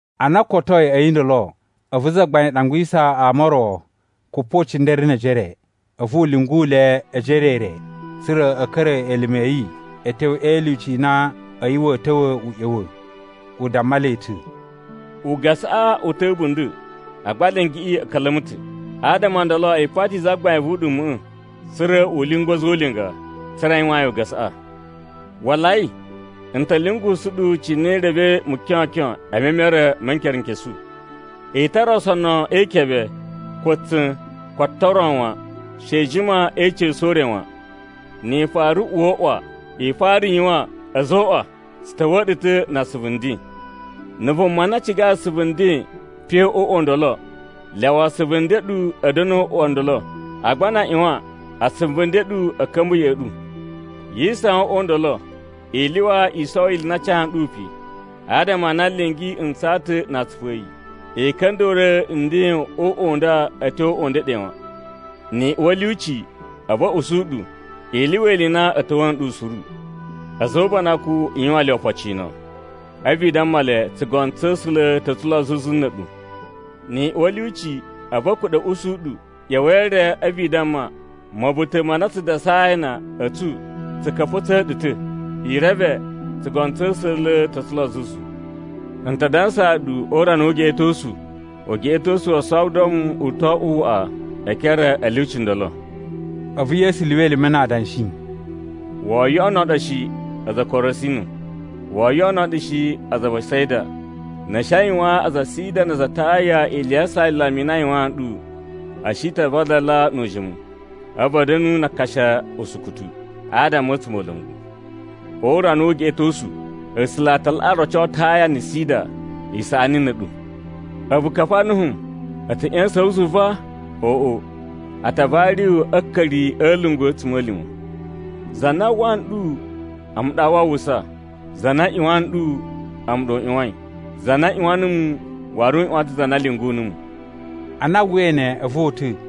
Ana o kotoi a̱yi ndolo, a̱vu Zagbain ɗangwisa ama o ro kupocindere ne ejere, a̱vu u lyungu le ejere-re, tsa̱ra̱ a̱ ka̱ra̱ elime a̱ yi a̱ tyo e ilyuci i na a̱yi wa̱a̱ ta̱wa̱ u ꞌya̱wa̱. U damma le ta̱, “Ugasaꞌa u ta̱ a̱bunda̱, agba alingiꞌi a̱ ka̱la̱ma̱ ta̱. Adama o ndolo i pati Zagbain vu uɗuma̱ꞌa̱, tsa̱ra̱ u lyungu a̱za̱ o ulinga, tsa̱ra̱ a yuwaan yi ugasaꞌa. Walai! N ta̱ lyungusu ɗu cine i revei mukyokyon e memere ma̱ nkerenkesu. I tara osonu e ikebe, ko tsa̱n, ko atan o ro wan. She i jima e ica̱su o ure wan. “Ni i fara uwa o uꞌwa, i fara yuwan, ‘A̱zoꞌwa! Tsu ta̱wa̱a̱ ɗu ta̱ na asuvu nden!’ Na̱ vuma na cigai asuvu nden pe o uꞌwa u ndolo, lyawa asuvu nden n ɗu a̱ da̱nu o uꞌwa u ndolo. Agba na a ꞌyuwan, asuvu nden n ɗu a̱ ka̱mba̱ ya̱ꞌa̱ ɗu. Yi isawan o uꞌwa u ndolo, i lyuwa i sowo ili i na a ca nɗu pe, adama a na lingi ntsaa ta̱ na atsupu a̱ yi. I ka̱nda̱ruwa̱ nden o uꞌwa u nda a̱ tyo o uꞌwa u ndeɗe wan. “Ni i uwa a̱ lyuci, a̱vu a̱ ushi ɗu, i lyuwa ili i na a̱ ta̱wa̱a̱ nɗu suru. A̱za̱ o ubanakun, i yuwaan le opocino. A̱vu i damma le, ‘Tsugono tsa̱ A̱sula̱ tsa̱ ta̱ lo zuzu na̱ a̱ɗu.’ Ni i uwa a̱ lyuci, a̱vu a̱ kuɗa̱ a̱ ushi ɗu, ꞌya̱wa̱i e re, a̱vu i damma, ‘Ma̱buta̱ ma na tsu dasai a ana a̱ tsu tsu ka̱pa̱tsa̱a̱ ɗu ta̱. I reve, tsugono tsa̱ A̱sula̱ tsa̱ ta̱ lo zuzu.’ N ta dansaa ɗu o urana wu ugeꞌetosu, ugeꞌetosu wo Sodom u to oꞌwo waꞌa e ekere a̱ lyuci ndolo.” A̱vu Yesu lyuwa elime na adanshi, “Woo yoꞌono ɗu shi, aza a Korasinu, woo yoꞌono ɗu shi, aza a Besaida. Na̱ a̱ shi a yuwaan aza a Sida na aza a Taya ili ya asalama i na a yuwaan ɗu, a̱ shi ta vadala nu ujimu, a̱vu a̱ da̱nu na akashi usukutu, adama a̱ a̱tsumola̱ngu. O urana wu ugeꞌetosu, A̱sula̱ a ta laꞌa roco Taya na̱ Sida isaꞌani na̱ a̱ɗu. A̱vu Kafarnahum, a̱ ta̱ ꞌya̱sa̱n wu zuva? Oꞌo, a ta vari wu a̱ a̱a̱ka̱ri a̱ a̱lungu a̱ a̱tsuma̱lima̱. “Za na uwwa nɗu, a̱mu ɗa waa uwwusa. Za na ꞌyuwan ɗu, a̱mu ɗa u ꞌyuwain. Za na ꞌyuwan numu waru u ꞌyuwan ta̱ za na lyungu numu.” Ana a uwwai ne, a̱vu o uta̱.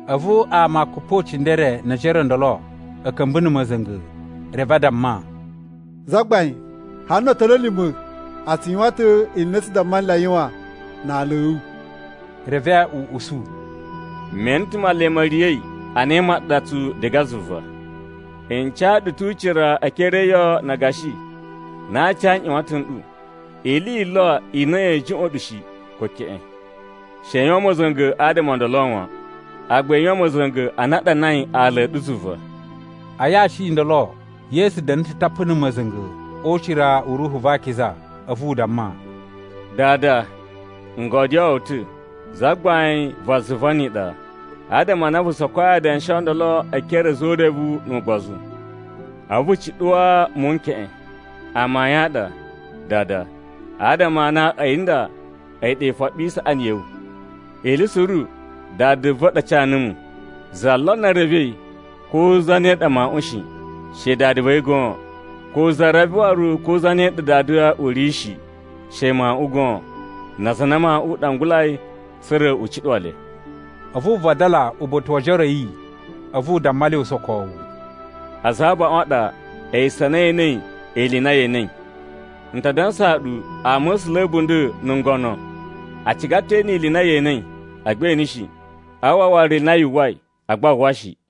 A̱vu ama kupocindere ne ejere o ndolo a̱ ka̱mba̱ na̱ ma̱za̱nga̱, reve a damma, “Zagbain, hali no otoni a̱ lima̱ a tsu yuwan ta̱ ili i na tsu damma nle a yuwan a ala a̱ wu.” Reve u usu, “Me ene ta̱ Male ma̱ riya̱i ana imaɗatsu diga zuva. N ca ɗu ta̱ ucira e ekere e iyo na agashi na a aci a nꞌyuwatan n ɗu. Ili yi lo i na ya̱a̱ juꞌwa̱n ɗu shi ko keꞌen. She i yuwan ma̱za̱nga̱ adama o ndolo wan, agba i yuwan ma̱za̱nga̱ ana a ɗanai ala a̱ ɗu zuva.” A yashi i ndolo, Yesu da̱na̱ ta̱ tapu na̱ ma̱za̱nga̱ o ucira u Ruhu va Akiza, a̱vu u damma, “Dada, n godyoo wu ta̱, Zagbain va zuva ni iɗa, adama a na vu sokoi adanshi o ndolo e ekere a̱ a̱za̱ o urevu nu ugbozu, a̱vu vu cuɗuwaa muwun n keꞌen. Amayun a ɗa, Dada, adama a na a̱yi nda a̱yi ɗa ifoɓi i saꞌani ya̱ wu. “Ili suru Dada va̱ ɗa ca numu. Za lo revei ko zane ɗa Mawuꞌun shi, she Dada va̱ yi goon, ko za reve waru ko zane ɗa Dada u ri shi she Mawuꞌun goon, na aza a na Mawuꞌun u ɗangulai tsa̱ra̱ u cuɗuwa le.” A̱vu u vadala uba̱ta̱ wo ojoro a̱ yi, a̱vu u damma le usokowu, “Aza a abaꞌun a ɗa esu a na e enei ili i na ye enei. N ta dansaa ɗu ama̱sula̱ a̱ a̱bunda̱ na̱ ngono, a ciga ta̱ e ene ili i na ye enei, agba e ene shi. A uwwa waru ili i na yu uwwai, agba a uwwa shi.”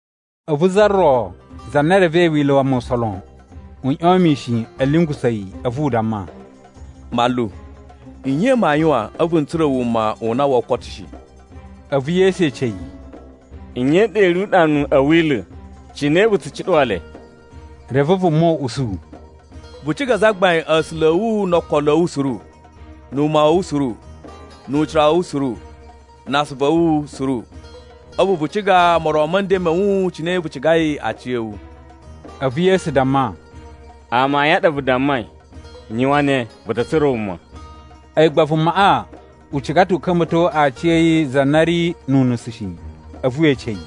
A̱vu za ro za na revei Wila̱ wa Musa lon, u ꞌyon mishin a̱ lyungusa̱ yi, a̱vu u damma, “Manlu, nye maa yuwan, a̱vu n tsura̱ wuma u na woo koto shi?” A̱vu Yesu ece yi, “Nye i ɗa i ri uɗanu a̱ Wila̱? Cine vu tsu cuɗuwa le?” Reve vuma u usu, “Vu ciga Zagbain A̱sula̱ a̱ wu no ookolo a̱ wu suru, na̱ wuma wa̱ wu suru, nu ucira wa̱ wu suru, na asuvu a̱ wu suru. A̱vu vu ciga moron ma̱ nden ma̱ wu cine vu cigai aciya̱wu.” A̱vu Yesu damma, “Amayun a ɗa vu dammai, yuwan ne vu ta̱ tsura̱ wuma.” A̱yi gba vumaꞌa u ciga ta̱ u ka̱mba̱to aciya̱yi za na ri nu unusu shi, a̱vu we ece yi,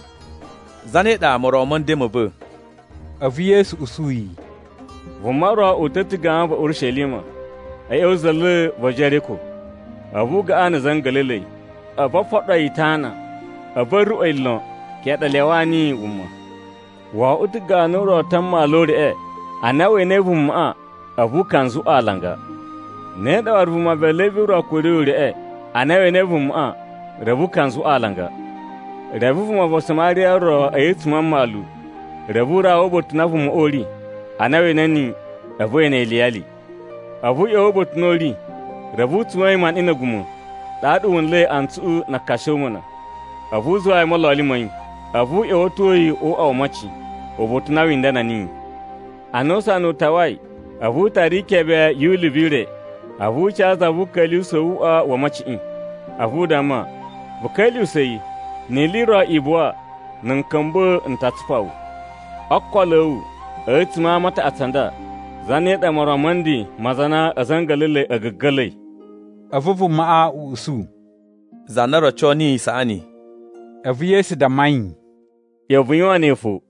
“Zane ɗa moron ma̱ nden ma̱ va̱?” A̱vu Yesu usu yi, “Vuma ro uta̱ ta̱ gawan va̱ Urishelima a̱ ꞌya̱wa̱ za̱la̱ va̱ Jeriko, a̱vu u gaꞌan na̱ a̱za̱ a̱ nga̱la̱la̱i. A̱vu o foɗo yi itana, a̱vu a̱ ruꞌwa̱ yi lon, keꞌen ɗa a lyawaa niyi wuma. Wo oꞌwo ta̱ ganu ro ta a mmalu o ureꞌe, ana we enei vumaꞌa, a̱vu u kanzuꞌwa alanga. Ne ɗa waru vuma va̱ Levi ro kuruyi ureꞌe, ana we enei vumaꞌa, reve u kanzuꞌwa alanga. Reve vuma va Samariya ro a̱yi a̱tsuma̱ a mmalu, reve u rawa uba̱ta̱ u na vumaꞌa u ri. Ana we ene niyi, a̱vu we ene yi iliyali. A̱vu u ꞌya̱wa̱ uba̱ta̱ u na u ri, reve u tsuwa̱n yi maniꞌin na̱ a̱guma̱, ɗaɗa wu nla̱i antsuꞌu na akashomuna. A̱vu u zuwa yi o mololi ma̱ yi. A̱vu u ꞌya̱wa̱to yi o uꞌwa wo omocin, uba̱ta̱ u na wi indana niyi. Ana usana u tawai, a̱vu u tara ikebe yu ulivu i re, a̱vu u ca za vu uka̱lyuwusa̱ wu uꞌwa wo omociꞌin. A̱vu u damma, ‘Vu ka̱lyuwusa̱ yi, ni ili i ro i buwa, na̱ n ka̱mba̱ n ta tsupa wu.’ “O ookolo a̱ wu, a̱tsuma̱ a ama a taꞌatsu a nda, zane ɗa moron ma̱ nden ma za na a̱za̱ a̱ nga̱la̱la̱i a̱ ga̱ga̱la̱i?” A̱vu vumaꞌa u usu, “Za na roco niyi isaꞌani.” A̱vu Yesu damma yi, “ꞌYa̱wa̱ vu yuwan ne fo.”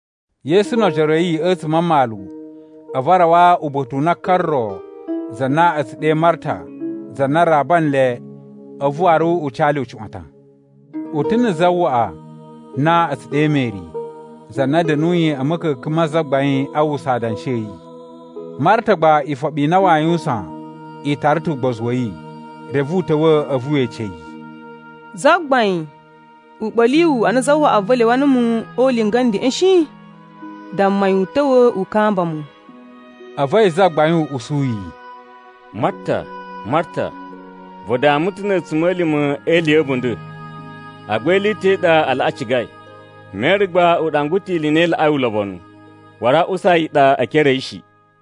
Yesu no ojoro a̱ yi a̱tsuma̱ a mmalu, a̱vu a rawa uba̱ta̱ u na ka ro za na a̱ tsu ɗe Marta, za na raba nle, a̱vu waru u ca le ucuꞌwatan. U ta̱ na̱ zawaꞌa na a̱ tsu ɗe Meri, za na da̱nuyi a̱ ma̱ka̱ka̱n ma Zagbain a uwwusa adanshi a̱ yi. Marta gba ifoɓi i na waa yuwusan i tara ta̱ ugbozu wa̱ yi. Reve u ta̱wa̱, a̱vu we ece yi, “Zagbain, u ɓa̱li wu ana zawaꞌa va̱ lyawa numu o ulinga a̱ ndeꞌen shi? Damma yi u ta̱wa̱ u kamba mu.” A̱vu a̱yi Zagbain u usu yi, “Marta, Marta, vu dama ta̱ na̱ a̱tsuma̱lima̱ e ili ya̱ a̱bunda̱, agba ili i ta̱ i ɗa a laꞌa cigai. Meri gba u ɗangwa ta̱ ili i na i laꞌai ulobonu, waru aa usa yi i ɗa e ekere a̱ yi shi.”